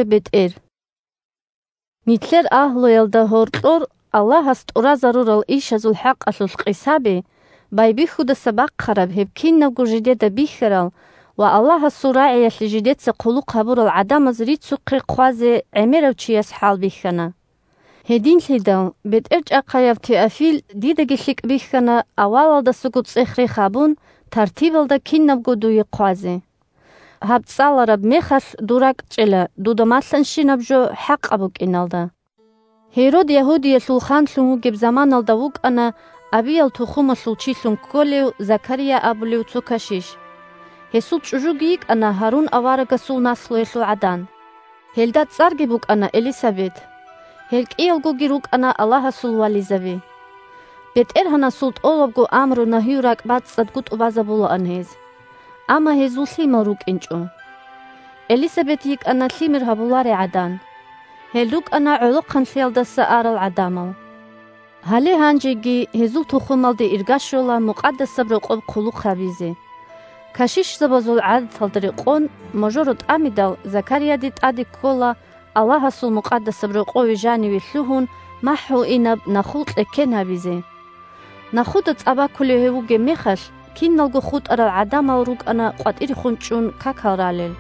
бетӀер Байбихьи 1-2Нилъер агьлуялда гьоркьор Аллагьас тӀуразарурал ишазул хӀакъалъулъ къисаби, байбихьудаса бахъараб гьеб кинабго жидеда бихьарал ва Аллагьасул РагӀиялъе жидеца хъулухъ гьабурал гӀадамаз рицухъе хъвазе гӀемерав чияс хӀалбихьана. Гьединлъидал, бетӀерчӀахъаяв Теофил, дидаги лъикӀ бихьана, авалалдасанго цӀех-рех гьабун, тартибалда кинабго дуе хъвазе. Гьаб цӀалараб мехалъ дур ракӀчӀела дуда малъанщинаб жо хӀакъаб букӀиналда. Гьерод Ягьудиялъул ханлъун вугеб заманаялда вукӀана Абиял тухумалъул чилъун кколев Закария абулев цо кашиш. Гьесул чӀужуги йикӀана Гьарун аварагасул наслуялъул гӀадан. Гьелда цӀарги букӀана Элисабет. Гьел кӀиялгоги рукӀана Аллагьасул вализаби. БетӀергьанасул тӀолабго амру-нагью ракӀбацӀцӀадго тӀубазабулаан гьез. Амма гьезул лъимал рукӀинчӀо. Элисабет йикӀана лъимер гьабуларей гӀадан. Гьел рукӀана гӀолохъанлъиялдаса арал гӀадамал. Гьале гьанжеги гьезул тухумалде ирга щола Мукъадасаб Рокъоб хъулухъ гьабизе. Кашишзабазул гӀадаталда рекъон, можоро тӀамидал, Закарияде тӀаде ккола, Аллагьасул Мукъадасаб Рокъове жаниве лъугьун, махӀгьуинаб нахул кьеккен гьабизе. Нахуда цӀа бакулев гьев вугеб мехалъ, киналго хутӀарал гӀадамал рукӀана къватӀирехун чӀун какал ралел.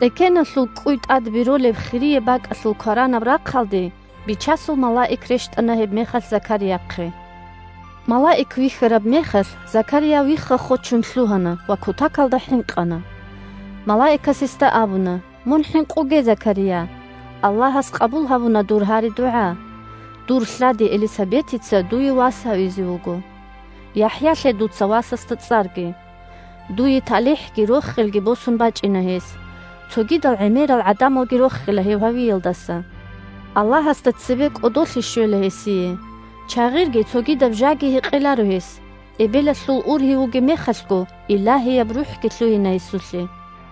Кьеккеналъул кӀкӀуй тӀад беролеб хирияб бакӀалъул кваранаб рахъалде Бичасул малаик рещтӀана гьебмехалъ Закарияхъе. Малаик вихьараб мехалъ, Закария вихха-хочун лъугьана ва кутакалда хӀинкъана. Малаикас гьесда абуна: – Мун хӀинкъуге, Закария, Аллагьас къабул гьабуна дур гьари-дугӀа. Дур лъади Элисабетица дуе вас гьавизе вуго. ЯхӀя лъе дуца васасда цӀарги. Дуе талихӀги рохелги босун бачӀина гьес, цогидал гӀемерал гӀадамалги рохила гьев гьавиялдаса. Аллагьасда цебе кӀодолъи щвела гьесие, чагъирги цогидаб жаги гьекъеларо гьес, эбелалъул ургьив вугеб мехалъго Илагьияб РухӀги лъугьина гьесулъе.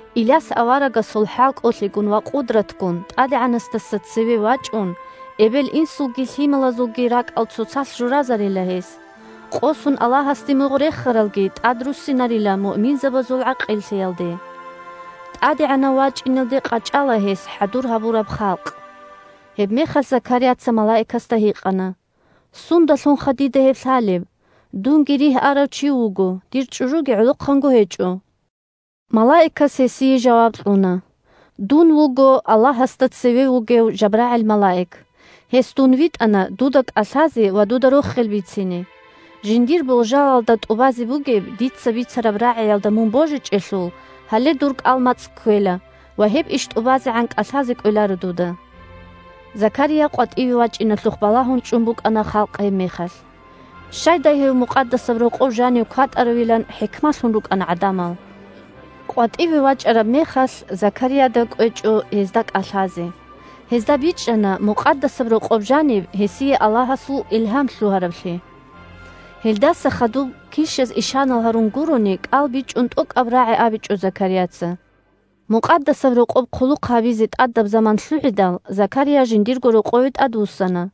Иляс аварагасул хӀалкӀолъигун ва къудратгун ТӀадегӀанасдаса цеве вачӀун, эбел-инсулги лъималазулги ракӀал цоцалъ журазарила гьес, къосун Аллагьасде мугъ рехаралги тӀадруссинарила муъминазул гӀакъиллъиялде. ТӀадегӀанав вачӀиналде къачӀала гьес хӀадур гьабураб халкъ. Гьебмехалъ Закарияца малаикасда гьикъана: – Сундалъунха дида гьеб лъалеб? Дунги ригь арав чи вуго, дир чӀужуги гӀолохъанго гьечӀо. Малаикас гьесие жаваб кьуна: – Дун вуго Аллагьасда цеве вугев ЖабрагӀил малаик. Гьес дун витӀана дуда кӀалъазе ва дуда рохел бицине. Жиндир болжалалда тӀубазе бугеб дица бицараб рагӀиялда мун божичӀелъул, гьале дур кӀал-мацӀ кквела ва гьеб иш тӀубазегӀан кӀалъазе кӀвеларо дуда. Закария къватӀиве вачӀиналъухъ балагьун чӀун букӀана халкъ гьебмехалъ. Щайдай гьев Мукъадасаб Рокъов жанив кватӀаравилан хӀикмалъун рукӀана гӀадамал. КъватӀиве вачӀараб мехалъ, Закарияда кӀвечӀо гьезда кӀалъазе. Гьезда бичӀчӀана Мукъадасаб Рокъоб жаниб гьесие Аллагьасул илгьам лъугьараблъи. Гьелдаса хадуб, килщаз ишанал гьарун гурони, кӀал бичӀун тӀокӀаб рагӀи абичӀо Закарияца. Мукъадасаб Рокъоб хъулухъ гьабизе тӀадаб заман лъугӀидал, Закария жиндирго рокъове тӀадвуссана.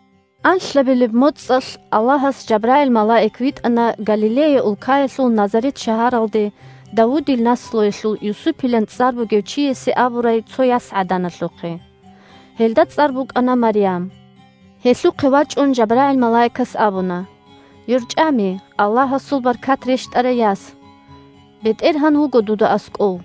Анлъабилеб моцӀалъ Аллагьас ЖабрагӀил малаик витӀана Галилея улкаялъул Назарет шагьаралде Давудил наслуялъул Юсупилан цӀар бугев чиясе абурай цо ясгӀаданалъухъе. Гьелда цӀар букӀана Марям. Гьелъухъе вачӀун ЖабрагӀил малаикас абуна: – ЙорчӀами, Аллагьасул баркат рещтӀарай яс! БетӀергьан вуго дуда аскӀов.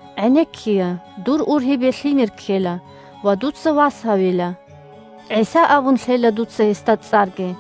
ГӀенеккея, дур ургьибе лъимер ккела, ва дуца вас гьавила. ГӀиса абун лъела дуца гьесда цӀарги.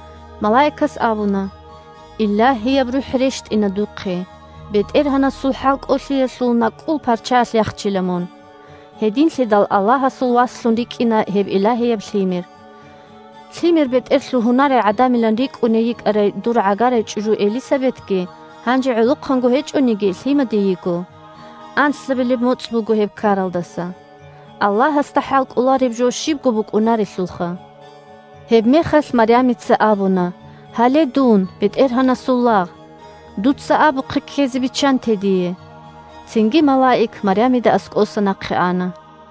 Малаикас абуна: – Илагьияб РухӀ рещтӀина духъе. БетӀергьанасул хӀалкӀолъиялъул накӀкӀул парчаялъ яхчила мун. Гьединлъидал Аллагьасул Васлъун рикӀкӀина гьеб Илагьияб Лъимер. Лъимер-бетӀер лъугьунарей гӀадамилан рикӀкӀуней йикӀарай дур гӀагарай чӀужу Элисабетги, гьанже гӀолохъанго гьечӀониги, лъимаде йиго. Анлъабилеб моцӀ буго гьеб ккаралдаса. Аллагьасда хӀалкӀолареб жо щибго букӀунарелъулха! Гьебмехалъ Марямица абуна: – Гьале, дун БетӀергьанасул лагъ! Дуца абухъе ккезе биччанте дие! Цинги малаик Марямида аскӀоса нахъе ана.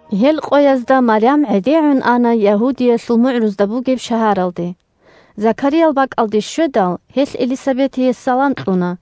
Гьел къоязда Марям гӀедегӀун ана Ягьудиялъул мугӀрузда бугеб шагьаралде. Закариял бакӀалде щведал, гьелъ Элисабетие салам кьуна.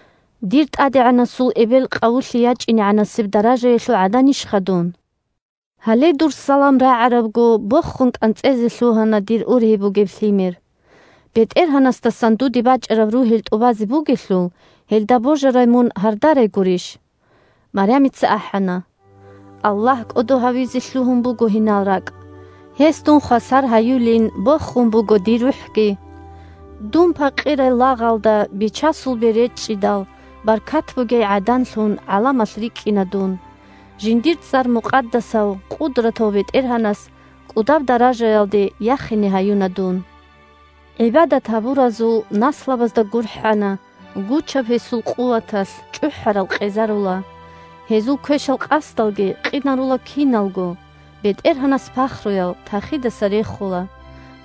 Дир ТӀадегӀанасул эбел къавулъе ячӀинегӀанасеб даражаялъул гӀаданищха дун! Гьале дур салам рагӀарабго, бохун кӀанцӀезе лъугьана дир ургьиб лъимер. БетӀергьанасдасан дуде бачӀараб ругьел тӀубазе бугелъул, гьелда божарай мун гьардарай гурищ. Марямица ахӀана: – Аллагь кӀодо гьавизе лъугьун буго гьинал ракӀ. Гьес дун хвасар гьаюлин бохун буго дир рухӀги. Дун пакъирай лагъалда Бичасул бер речӀчӀидал, Баркат бугей гӀаданлъун гӀаламалъ рикӀкӀина дун. Жиндир цӀар мукъадасав къудратав БетӀергьанас КӀудаб даражаялде яхине гьаюна дун. ГӀибадат гьабуразул наслабазда гурхӀана. Гучаб гьесул къуваталъ чӀухӀарал къезарула, Гьезул квешал къасдалги къинарула киналго. БетӀергьанас пахруял тахидаса рехула,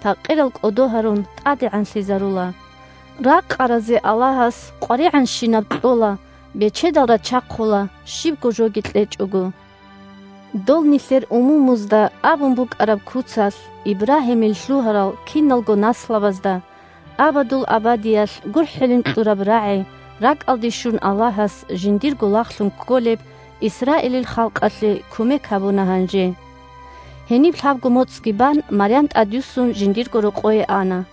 Пакъирал, кӀодо гьарун, тӀадегӀанлъизарула. Ракъаразе Аллагьас къваригӀанщинаб кьола, Бечедал рачахъула, щибго жоги кьечӀого. Дол нилъер умумузда абун букӀараб куцалъ, Ибрагьимил лъугьарал киналго наслабазда Абадул абадиялъ гурхӀилин кьураб рагӀи РакӀалде щун, Аллагьас жиндирго лагълъун кколеб Исраилил халкъалъе кумек гьабуна гьанже. Гьениб лъабго моцӀги бан, Марям тӀадюссун жиндирго рокъое ана.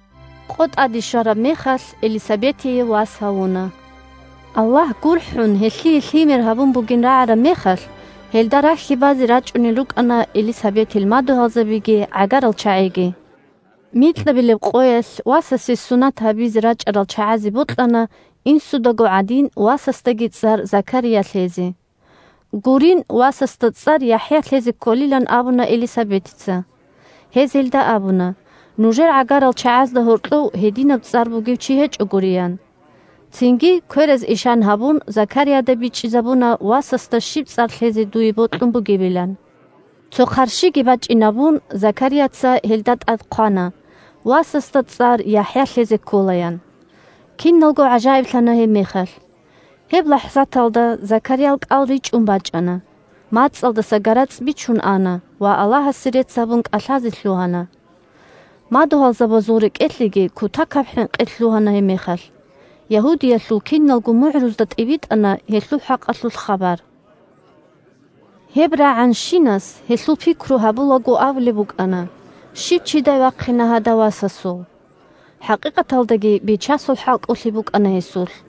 Къо тӀаде щвараб мехалъ, Элисабетие вас гьавуна. Аллагь гурхӀун гьелъие лъимер гьабун бугин рагӀараб мехалъ, гьелда рахьи базе рачӀунел рукӀана Элисабетил мадугьалзабиги гӀагарал чагӀиги. Микьабилеб къоялъ васасе сунат гьабизе рачӀарал чагӀазе бокьана, инсудаго гӀадин, васасда цӀарги Закария лъезе. Гурин, васасда цӀар ЯхӀя лъезе кколилан абуна Элисабетица. Гьез гьелда абуна: – Нужер гӀагарал чагӀазда гьоркьов гьединаб цӀар бугев чи гьечӀо гури, – ян. Цинги, квераз ишан гьабун, Закарияда бичӀчӀизабуна васасда щиб цӀар лъезе дуе бокьун бугебилан. Цо хъарщиги бачӀинабун, Закарияца гьелда тӀад хъвана: «Васасда цӀар ЯхӀя лъезе ккола», – ян. Киналго гӀажаиблъана гьебмехалъ. Гьеб лахӀзаталда Закариял кӀал ричӀун бачӀана, мацӀалдаса гарацӀ бичун ана ва Аллагьасе рецц гьабун кӀалъазе лъугьана. Мадугьалзабазул рекӀелъеги кутакаб хӀинкъи лъугьана гьебмехалъ, Ягьудиялъул киналго мугӀрузда тӀибитӀана гьелъул хӀакъалъулъ хабар. Гьеб рагӀанщинас, гьелъул пикру гьабулаго, абулеб букӀана: – Щив чидай вахъина гьадав васасул? ХӀакъикъаталдаги Бичасул хӀалкӀолъи букӀана гьесулъ.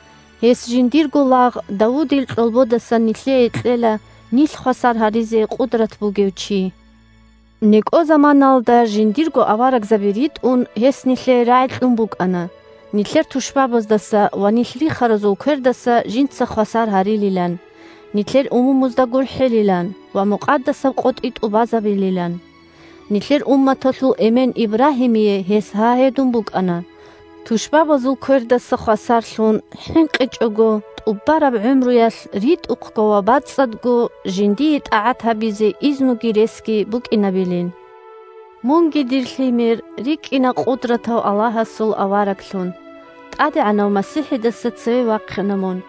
Гьес жиндирго лагъ Давудил кьолбодасан нилъее кьела Нилъ хвасар гьаризе къудрат бугев чи. НекӀо заманаялда жиндирго аварагзаби ритӀун, Гьес нилъее рагӀи кьун букӀана: Нилъер тушбабаздаса ва нилъ рихаразул квердаса Жинца хвасар гьарилилан, Нилъер умумузда гурхӀилилан Ва мукъадасаб къотӀи тӀубазабилилан. Нилъер умматалъул эмен Ибрагьимие гьес гьа гьедун букӀана, Тушбабазул квердаса хвасарлъун, ХӀинкъичӀого тӀубараб гӀумруялъ РитӀухъго ва бацӀцӀадго Жиндие тӀагӀат гьабизе изнуги ресги букӀинабилин. Мунги, дир лъимер, рикӀкӀина Къудратав Аллагьасул авараглъун, ТӀадегӀанав МасихӀидаса цеве вахъина мун,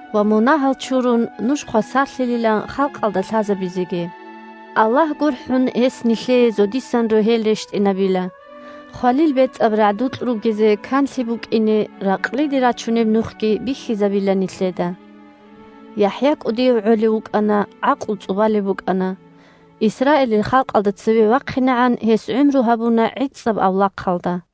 Ва, мунагьал чурун, нуж хвасарлъилилан Халкъалда лъазабизеги. Аллагь гурхӀун, гьес нилъее зодисан рогьел рещтӀинабила, Хвалил бецӀаб рагӀдукь ругезе канлъи букӀине, Ракълиде рачунеб нухги бихьизабила нилъеда. ЯхӀя кӀудияв гӀолев вукӀана, гӀакълу цӀубалеб букӀана. Исраилил халкъалда цеве вахъинегӀан гьес гӀумру гьабуна гӀицӀаб авлахъалда.